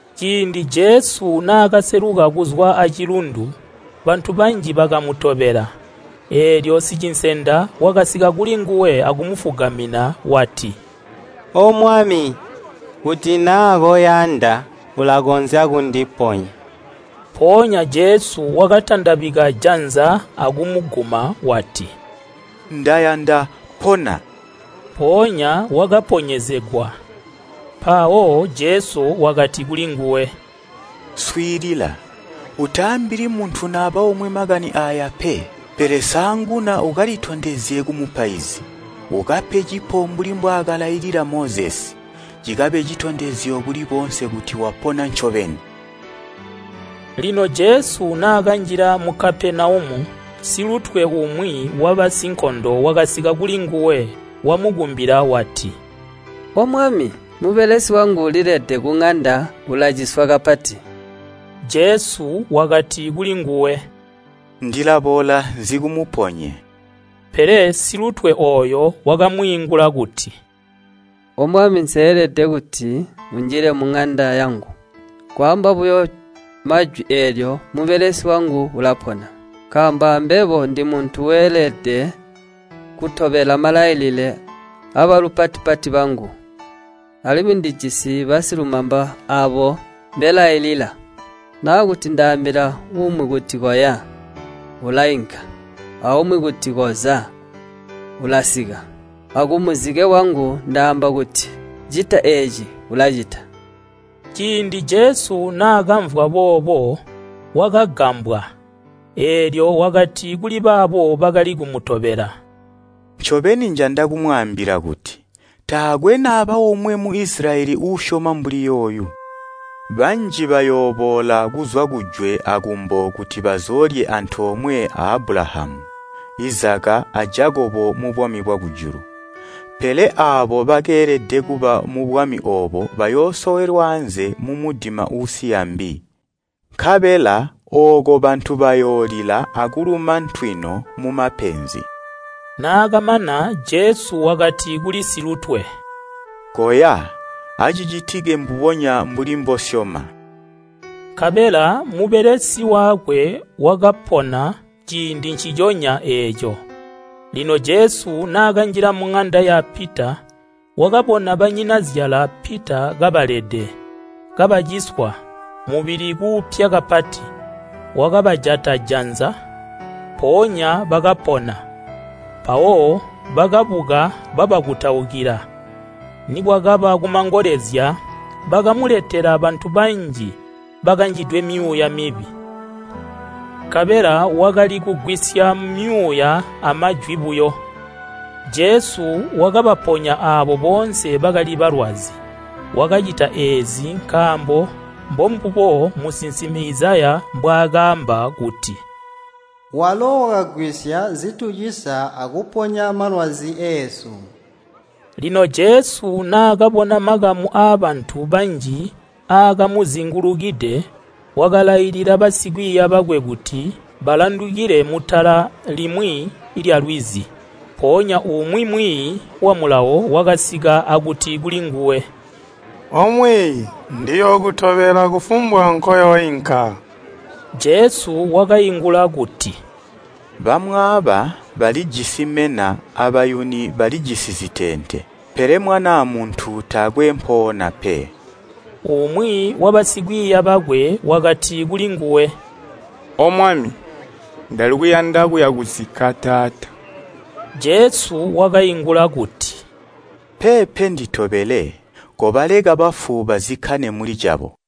Ciindi Jesu naakaseluka kuzwa acilundu, bantu banji bakamutobela. Eelyo sicinsenda wakasika kulinguwe akumufugamina wati, “O Mwami, kuti naa koyanda, ulakonzya kundiponya.” Mpoonya Jesu wakatandabika janza akumuguma wati, “Ndayanda, pona!” Mpoonya wakaponyezegwa. Mpawo Jesu wakati kulinguwe, “Swiilila, utaambili muntu naba omwe makani aaya pe. Pele saanguna ukalitondezye kumupaizi, ukape cipo mbuli mbwaakalailila Mozesi, cikabe citondezyo kuli boonse kuti wapona ncobeni.” Lino Jesu naakanjila mu Kapenaumu, silutwe umwi wabasinkondo wakasika kulinguwe. Wamukumbila wati, “O Mwami, mubelesi wangu ulilede kuŋanda ulaciswa kapati.” Jesu wakati kulinguwe, “Ndilaboola nzikumuponye.” Pele silutwe ooyo wakamwiingula kuti, “O Mwami, nseelede kuti unjile muŋanda yangu. Nkwaamba buyo majwi eelyo mubelesi wangu ulapona. Nkaambo ambebo ndimuntu weelede kutobela malailile abalupati-pati bangu, alimwi ndijisi basilumamba aabo mbelailila. Naakuti, ndaambila umwi kuti ‘Koya,’ ulainka, aumwi kuti, ‘Koza’ ulasika. Akumuzike wangu ndaamba kuti, ‘Cita eeci,’ ulacicita.” Ciindi Jesu naakamvwa boobo, wakagambwa, eelyo wakati kuli baabo bakali kumutobela, “Ncobeni njanda kumwaambila kuti, ‘Taakwe naba omwe mu Isilayeli uusyoma mbuli yooyu.’ Banji bayooboola kuzwa kujwe akumbo kuti bazoolye antoomwe a Abulahamu, Izaka a Jakobo mubwami bwakujulu. Pele aabo bakeelede kuba mubwami oobo bayoosowelwa anze mumudima uusiya mbi, nkabela ooko bantu bayoolila akuluma ntwino mumapenzi.” Naakamana Jesu wakati kuli silutwe, “Koya acicitike mbubonya mbuli mbosyoma.” Nkabela mubelesi wakwe wakapona ciindi nciconya eeco. Lino Jesu naakanjila muŋanda ya Pita, wakabona banyinazyala Pita kabalede, kabaciswa mubili kuupya kapati. Wakabajata janza, mpoonya bakapona, mpawo bakabuka babakutaukila. Nikwakaba kumangolezya bakamuletela bantu banji bakanjidwe myuuya mibi, nkabela wakali kugwisya myuuya amajwi buyo. Jesu wakabaponya aabo boonse bakali balwazi. Wakacita eezi nkaambo mbombubo musinsimi Izaya mbwaakaamba kuti, “Walo wakagwisya zitucisa akuponya malwazi eesu.” Lino Jesu naakabona makamu aabantu banji aakamuzingulukide, wakalailila basikwiiya bakwe kuti balandukile mutala limwi lyalwizi. Mpoonya umwi mwiiyi wa Mulawo wakasika akuti kulinguwe, “O Mwiiyi, ndiyookutobela kufumbwa nkoyooinka.” Jesu wakaingula kuti, “Bamwaaba balijisi mena abayuni balijisi ziteente, pele Mwanaa Muntu taakwe mpoona pe.” Umwi wabasikwiiya bakwe wakati kulinguwe, “O Mwami, ndali kuyanda kuya kukuzikka taata.” Jesu wakaingula kuti, “Peepe nditobele, kobaleka bafu bazikkane muli cabo.”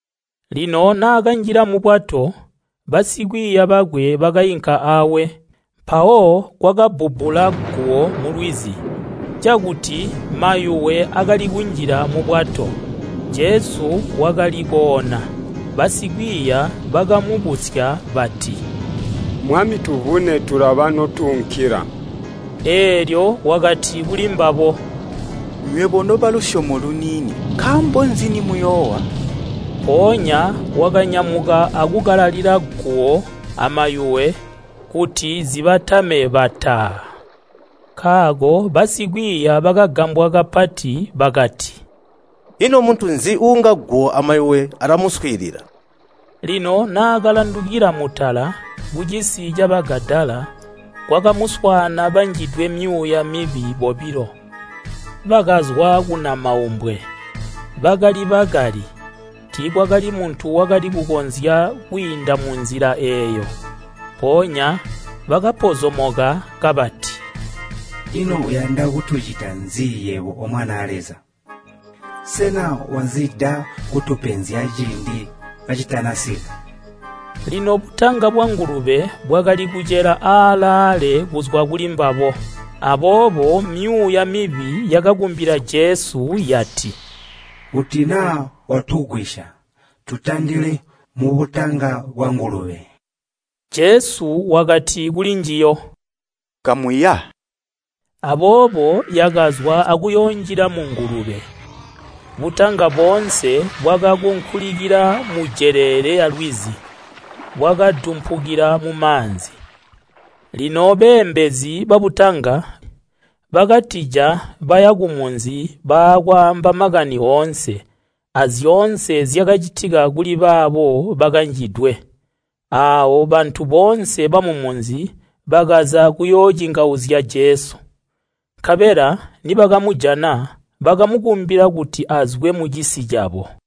Lino naakanjila mubwato, basikwiiya bakwe bakainka awe. Mpawo kwakabbubbula guwo mulwizi, cakuti mayuwe akali kunjila mubwato. Jesu wakali koona, basikwiiya bakamubusya bati, “Mwami tuvune tulaba notuunkila!” Eelyo wakati kulimbabo, “Nywebo nobalusyomo luniini, nkaambo nzi nimuyoowa?” Mpoonya wakanyamuka akukalalila guwo amayuwe kuti zibatame bataa! Nkaako basikwiiya bakagambwa kapati bakati, “Ino muntu nzi uunga guwo amayuwe alamuswiilila?” Lino naakalandukila mutala, kucisi ca Bagadala, kwakamuswaana banjidwe myuuya mibi bobilo, bakazwa kunamaumbwe. Bakali bakali, tiikwakali muntu wakali kukonzya kwiinda munzila eeyo. Mpoonya bakapozomoka kabati, “Ino uyanda kutucita nzi yebo O Mwanaa Leza? Sena wazida kutupenzya ciindi kacitanasika?” Lino butanga bwangulube bwakali kucela aalaale kuzwa kulimbabo. Aboobo myuuya mibi yakakumbila Jesu yati, “Kuti naa watugwisya tutandile mubutanga bwangulube.” Jesu wakati kulinjiyo, “Kamuya.” Aboobo yakazwa akuyoonjila mungulube, butanga boonse bwakakunkulikila mujeleele yalwizi, bwakadumpukila mumaanzi. Lino beembezi babutanga bakatija baya kumunzi bakwaamba makani oonse, azyoonse zyakacitika kuli baabo bakanjidwe. Aawo bantu boonse bamumunzi bakaza kuyoocingauzya Jesu. Nkabela nibakamujana, bakamukumbila kuti azwe mucisi cabo.